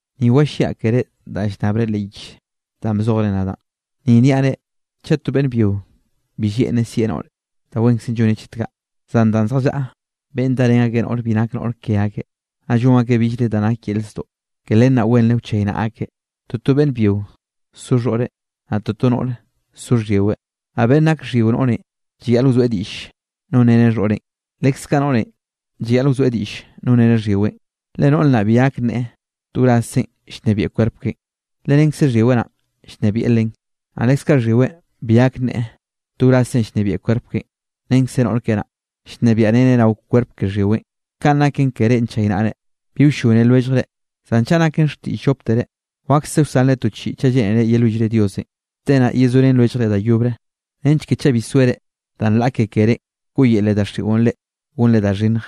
Ni walliaꞌ kerénꞌ danꞌ llnnabre leꞌ yich danꞌ bzojre nadaꞌn, ni niaꞌ reꞌ chaꞌ to beꞌnn byio bi lleꞌnreꞌ sieꞌ noꞌre, da wenkzenꞌ lloneꞌ chet kaꞌ. Zan danꞌ zjallaꞌa beꞌnn darén akeꞌ noꞌre bi nak noꞌr ke akeꞌ, naꞌ llon akeꞌ billre da nak yel zdoꞌ, ke len naꞌ wenre wchaynaꞌa akeꞌ, toto beꞌnn byio so xhoꞌreꞌ, naꞌ toto noꞌre so xhyiweꞌ. Naꞌ beꞌnn nak xhyio noꞌrenꞌ llayaꞌl wzoeꞌ diꞌll nonreneꞌ xhoꞌreꞌn, leskaꞌ noꞌrenꞌ llayaꞌl wzoeꞌ diꞌll nonreneꞌ xhyiweꞌn. Le noꞌr naꞌ bi gak nneꞌe to wrazzeꞌn llnebieꞌ kwerp keꞌen, le renkze xhyiweꞌ naꞌ llnebieꞌ len. Naꞌ leskaꞌ xhyiweꞌn bi gak nneꞌe to wrazzeꞌn llnebieꞌ kwerp keꞌen, renkze noꞌr keꞌe naꞌ, llnebiaꞌreneꞌ rao kwerp ke xhyiweꞌn. Kanꞌ naken ke reꞌ nchaynaꞌre, bi wllone lwelljre, zan chaꞌ naken xtiꞌll lloptere, wakse wsanre to chiꞌi chaꞌ lleꞌnere yelwillre Diosenꞌ. Te naꞌ yezorén lwelljre da yobre, nench ke chaꞌ bi zoere danꞌ laꞌa ke kerénꞌ, wkoꞌyele daxiꞌon reꞌ gonre da xhinnj.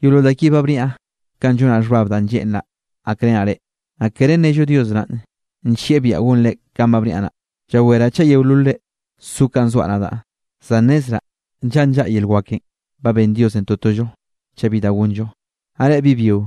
Yeolol da ki ba bniaꞌ kanꞌ llonaꞌ xhbab danꞌ lleꞌnraꞌ gakrenaꞌ reꞌ, naꞌ kere nnello Dios naꞌn nllieꞌ biaꞌa gonre kanꞌ ba bniaꞌ naꞌ. Llaweraꞌ chaꞌ yeololre so kanꞌ zoaꞌ nadaꞌ. Zan nnezraꞌ nllaꞌa nllaꞌa yel wakenꞌ ba benn Diosenꞌ totollo chaꞌ bi da gonllo. Naꞌ reꞌ bi byio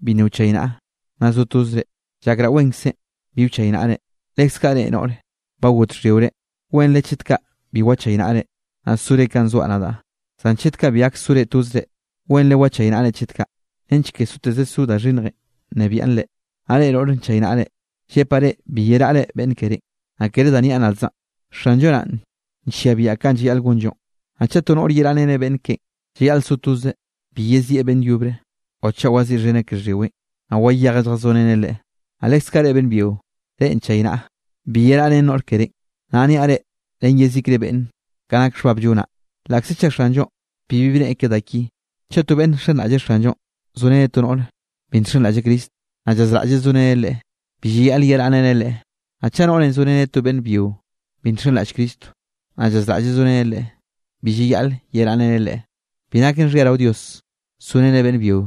bi nna wchaynaꞌa nna zo tozre, llakraꞌ wenkzenꞌ bi wchaynaꞌre, leskaꞌ reꞌ noꞌre ba got xhyiore, wenre chet kaꞌ bi wachaynaꞌre, naꞌ sore kanꞌ zoaꞌ nadaꞌ. Zan chet kaꞌ bi gak sore tozre, wenre wchaynaꞌre chet kaꞌ, nench ke soteze so da xhinnjenꞌ nnebiaꞌn reꞌ. Naꞌ reꞌ noꞌre nchaynaꞌre, llepaꞌ reꞌ bi yeraꞌre beꞌnn kerénꞌ. Naꞌ kere da niaꞌ nadzaꞌn, Xanllo naꞌn nllia biaꞌa kanꞌ llayaꞌl gonllonꞌ. Naꞌ chaꞌ to noꞌre yeraꞌreneꞌ beꞌnn keꞌen, llayaꞌl so tozeꞌ, bi yezieꞌ beꞌnn yobre o chaꞌ waziꞌxheneꞌ ke xhyiweꞌn, naꞌ wayejeꞌ lljazoreneꞌ leꞌe. Naꞌ leskaꞌ reꞌ beꞌnn byio reꞌ nchaynaꞌa, bi yeraꞌ ren noꞌr kerénꞌ. Naꞌ niaꞌ reꞌ ren yezikre beꞌnne, ka nak xhbab llonaꞌ, laꞌkze chaꞌ Xanllonꞌ bibi bneꞌe ke da ki. Chaꞌ to beꞌnne nxenraꞌlle Xanllo zoreneꞌ to noꞌre bi nxenraꞌlle Cristonꞌ, naꞌ llazraꞌlleꞌ soreneꞌ leꞌe, bi llayaꞌl yeraꞌreneꞌ leꞌe. Naꞌ chaꞌ noꞌre zoreneꞌ to beꞌnn byio bi nxenraꞌll Cristo, naꞌ llazraꞌlleꞌ soreneꞌ leꞌe, bi llayaꞌl yeraꞌreneꞌ leꞌe. Bi naken xhia rao Dios sorenre beꞌnn byio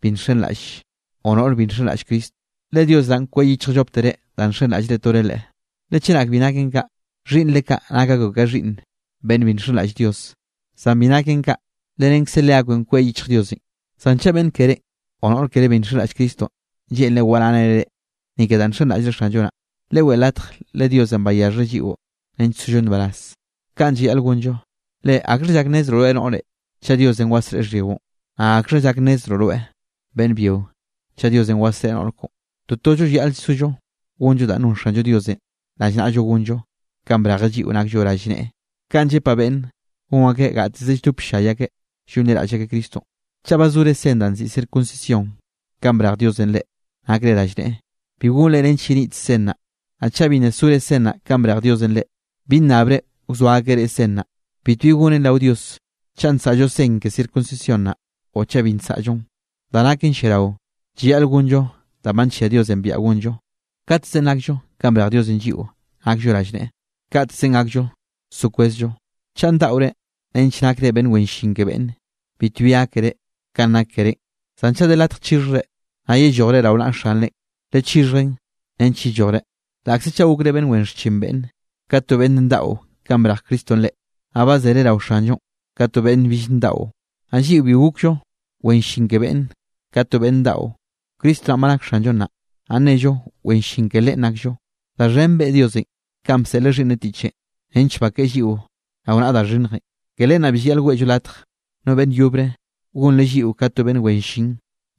bi nxenraꞌlle o noꞌr bi nxenraꞌll Cristonꞌ, le Dios naꞌ kweꞌ yichjkzeꞌ lloptere danꞌ nxenraꞌll tore Leꞌe. Le chenak bi naken kaꞌ, xhiꞌnnre kaꞌ nak akbeꞌ ka xhiꞌnn beꞌnn bi nxenraꞌll Dios, zan bi naken kaꞌ, le renkze leakbeꞌn kweꞌ yichj Diosenꞌ. Zan chaꞌ beꞌnn keré o noꞌr keré bi nxenraꞌll Cristonꞌ lleꞌnreꞌ waraꞌreneꞌ reꞌ, ni ke danꞌ nxenraꞌllre Xanllo naꞌ, leweꞌe latj le Diosenꞌ bayaxheꞌ lliꞌo nench sollo nbaraz. Kaꞌn llayaꞌl gonllo. Le ¿akxha llak nnezroꞌ rweꞌ noꞌre, chaꞌ Diosenꞌ wasreꞌe xhyiꞌon? Naꞌ ¿akxha llak nnezroꞌ rweꞌ, beꞌnn byio, chaꞌ Diosenꞌ wasreꞌe noꞌr koꞌon? Totollo llayaꞌl sollo gonllo danꞌ non Xanllo Diosenꞌ rallnaꞌllo gonllo kanꞌ brejeꞌ lliꞌo nakllo rallneꞌe. Kaꞌn llepaꞌ beꞌnne gon akeꞌ gateze lldop ll-llay akeꞌ llonliraꞌll akeꞌ Cristonꞌ. Chaꞌ ba zore sen danꞌ nziꞌi circuncisión kanꞌ brej Diosenꞌ reꞌ nakre rallneꞌe, bi gonre nench yenit sen naꞌ. Naꞌ chaꞌ bi nna sore sen naꞌ kanꞌ brej Diosenꞌ reꞌ, bi nnabre wzoa akeꞌ reꞌ sen naꞌ. Bitbi gonen rao Dios, chaꞌ nsaꞌllo sen ke circuncisión naꞌ, o chaꞌ bi nsaꞌllon. Da naken lliarao, llayaꞌl gonllo danꞌ ba nllia Diosenꞌ biaꞌa gonllo. Kaꞌtezenꞌ nakllo kanꞌ brej Diosenꞌ lliꞌo nakllo rallneꞌe, kaꞌtezenꞌ gakllo so kwezllo. Chaꞌ ndaꞌore nench nakre beꞌnn wen llin ke beꞌnne, bitbi gákere kanꞌ nak kerénꞌ. Zan chaꞌ de latj chixhjre, naꞌ yellojre rao naꞌa xanrenꞌ, lechixhjen nench yellojre. Laꞌkze chaꞌ gokre beꞌnn wen xchin beꞌnne, ka to beꞌnn ndaꞌo kanꞌ brej Cristonꞌ reꞌ, nnaꞌ ba zere rao Xanllonꞌ ka to beꞌnn bill ndaꞌo. Naꞌ lliꞌo bi gokllo wen llin ke beꞌnne ka to beꞌnn ndaꞌo, Cristo naꞌn ba nak Xanllo nnaꞌ, naꞌ nnello wen llin ke Leꞌen nakllo. Da xhen beꞌe Diosenꞌ kanꞌ bseꞌleꞌ Xhiꞌnneꞌ tiꞌchenꞌ nench bakeꞌe lliꞌo rao naꞌa da xhinnjenꞌ. Ke len naꞌ bi llayaꞌl weꞌllo latj no beꞌnn yobre gonreꞌ lliꞌo ka to beꞌnn wen llin,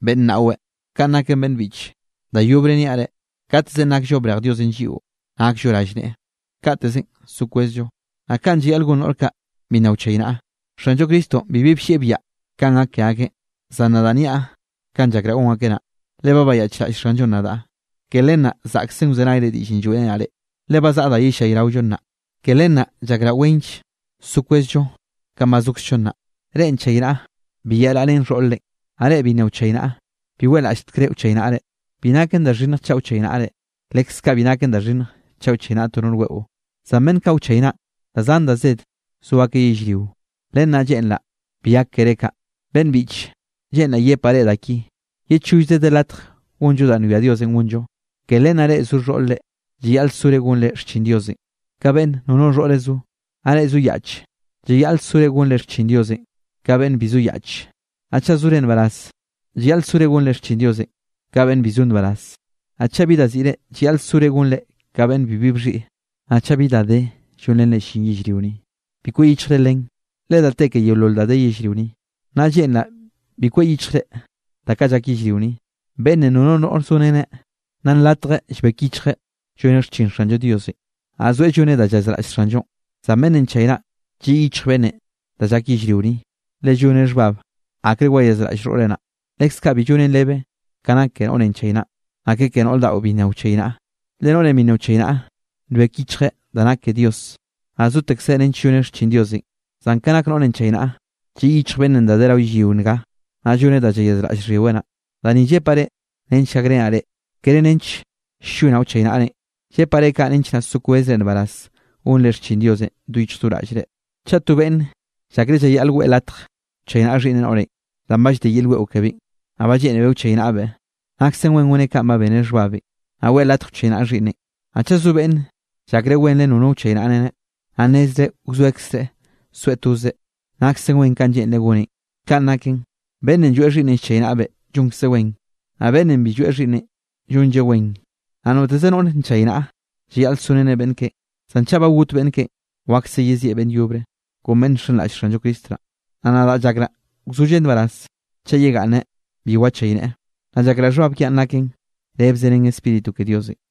beꞌnn naꞌweꞌ. Kaꞌn naken beꞌnn biꞌche, da yobre niaꞌ reꞌ, kaꞌtezenꞌ nakllo brej Diosenꞌ lliꞌo nakllo rallneꞌe, kaꞌtezenꞌ so kwezllo. Naꞌ kanꞌ llayaꞌl gon noꞌr kaꞌ bi nna wchaynaꞌa; Xanllo Cristonꞌ bibi bllieꞌ biaꞌa kanꞌ gak ke akeꞌn, zan nadaꞌ nniaꞌ kanꞌ llakraꞌ gon akeꞌ naꞌ. Le ba bayaꞌchraꞌll Xanllonꞌ nadaꞌ, ke len naꞌ zaꞌksen wzenayre diꞌllenꞌ lloeꞌrenaꞌ reꞌ. Le ba zaꞌa da yellayraollo nnaꞌ, ke len naꞌ llakraꞌ wenll so kwezllo kanꞌ ba zokzllo nnaꞌ. Reꞌ nchaynaꞌa, bi yeraꞌrén xhoꞌr-re, naꞌ reꞌ bi nna wchaynaꞌa bi weꞌlaꞌlltekre wchaynaꞌre. Bi naken da xhinnj chaꞌ wchaynaꞌre, leskaꞌ bi naken da xhinnj chaꞌ wchaynaꞌa to noꞌr weꞌo. Zan beꞌnn kaꞌ wchaynaꞌn da zan da zed so akeꞌ yellrio, len naꞌ lleꞌnraꞌ bi gak keré kaꞌ. Beꞌnn biꞌche, lleꞌnraꞌ yepaꞌ reꞌ da ki: Ye chollze de latj gonllo danꞌ nwia Diosenꞌ gonllo. Ke len naꞌ reꞌ zo xhoꞌr-re llayaꞌl sore gonre xchin Diosenꞌ, ka beꞌnn nono xhoꞌreꞌ zo. Naꞌ reꞌ zo yaꞌche, llayaꞌl sore gonre xchin Diosenꞌ ka beꞌnn bi zo yaꞌch. Naꞌ chaꞌ zore nbaraz, llayaꞌl sore gonre xchin Diosenꞌ ka beꞌnn bi zo nbaraz. Naꞌ chaꞌ bi da siꞌre, llayaꞌl sore gonre ka beꞌnn bibi bxhiꞌi. Naꞌ chaꞌ bi da de llonrenre llin yellrio ni, bi kweꞌ yichjre len, le da te ke yeolol da de yellrio ni. Naꞌ lleꞌnraꞌ bi kweꞌ yichjre da kaꞌ llak yellrio ni. Beꞌnne nono noꞌr zoreneꞌ, naꞌ nlatjeꞌ llbek yichjeꞌ lloneꞌ xchin Xanllo Diosenꞌ, naꞌ zoeꞌ lloneꞌ da llayazraꞌll Xanllonꞌ. Zan beꞌnnenꞌ nchaynaꞌa, lliꞌ yichj beꞌnnenꞌ da llak rao yellrio ni, le lloneꞌ xhbab akre wayazraꞌll xhoꞌreꞌ naꞌ. Leskaꞌ bi llonen rebe ka nak ke noꞌrenꞌ nchaynaꞌn, naꞌ ke noꞌr daꞌo bi nna wchaynaꞌa. Le noꞌrenꞌ bi nchaynaꞌa nbek yichjeꞌ da nak ke Dios, naꞌ zotekzeꞌ nench lloneꞌ xchin Diosenꞌ. Zan ke nak noꞌrenꞌ nchaynaꞌa, lliꞌ yichj beꞌnnenꞌ da de rao yellrio nga, naꞌ lloneꞌ da llayazraꞌll xhyiweꞌ naꞌ. Da ni llepaꞌ reꞌ nench gakrenaꞌ reꞌ, kere nench ll-llonaꞌ wchaynaꞌrenꞌ. Llepaꞌ reꞌ kaꞌ nench naꞌ so kwezre nbaraz gonre xchin Diosenꞌ do yichj do raꞌllre. Chaꞌ to beꞌnne llakreꞌ llayaꞌl weꞌe latj wchaynaꞌa xhiꞌnneꞌ noꞌrenꞌ, danꞌ ba llde yel weꞌo kebeꞌn, naꞌ ba lleꞌnebeꞌ wchaynaꞌbeꞌ, naksen wen goneꞌ kanꞌ ba beneꞌ xhbabenꞌ, naꞌ weꞌe latj wchaynaꞌa xhiꞌnneꞌn. Naꞌ chaꞌ zo beꞌnne llakreꞌ wenre nono wchaynaꞌreneꞌ, naꞌ nnezreꞌ wzoekzreꞌ soeꞌ tozeꞌ, naksen wen kanꞌ lleꞌnreꞌ goneꞌn. Kaꞌn naken, beꞌnnenꞌ lloeꞌ xhiꞌnneꞌn llchaynaꞌbeꞌ llonkzeꞌ wen, naꞌ beꞌnnenꞌ bi lloeꞌ xhiꞌnneꞌn llonlleꞌ wen. Naꞌ noteze noꞌr nchaynaꞌa, llayaꞌl soreneꞌ beꞌnn keꞌen, zan chaꞌ ba got beꞌnn keꞌen, wakse yezieꞌ beꞌnn yobre, kon beꞌnn nxenraꞌll Xanllo Cristo naꞌ. Naꞌ nadaꞌ llakraꞌ wzolleꞌ nbaraz chaꞌ yegaꞌnneꞌ bi wachayneꞌe. Naꞌ llakraꞌ xhbab kiaꞌn naken rebze ren Spíritu ke Diosenꞌ.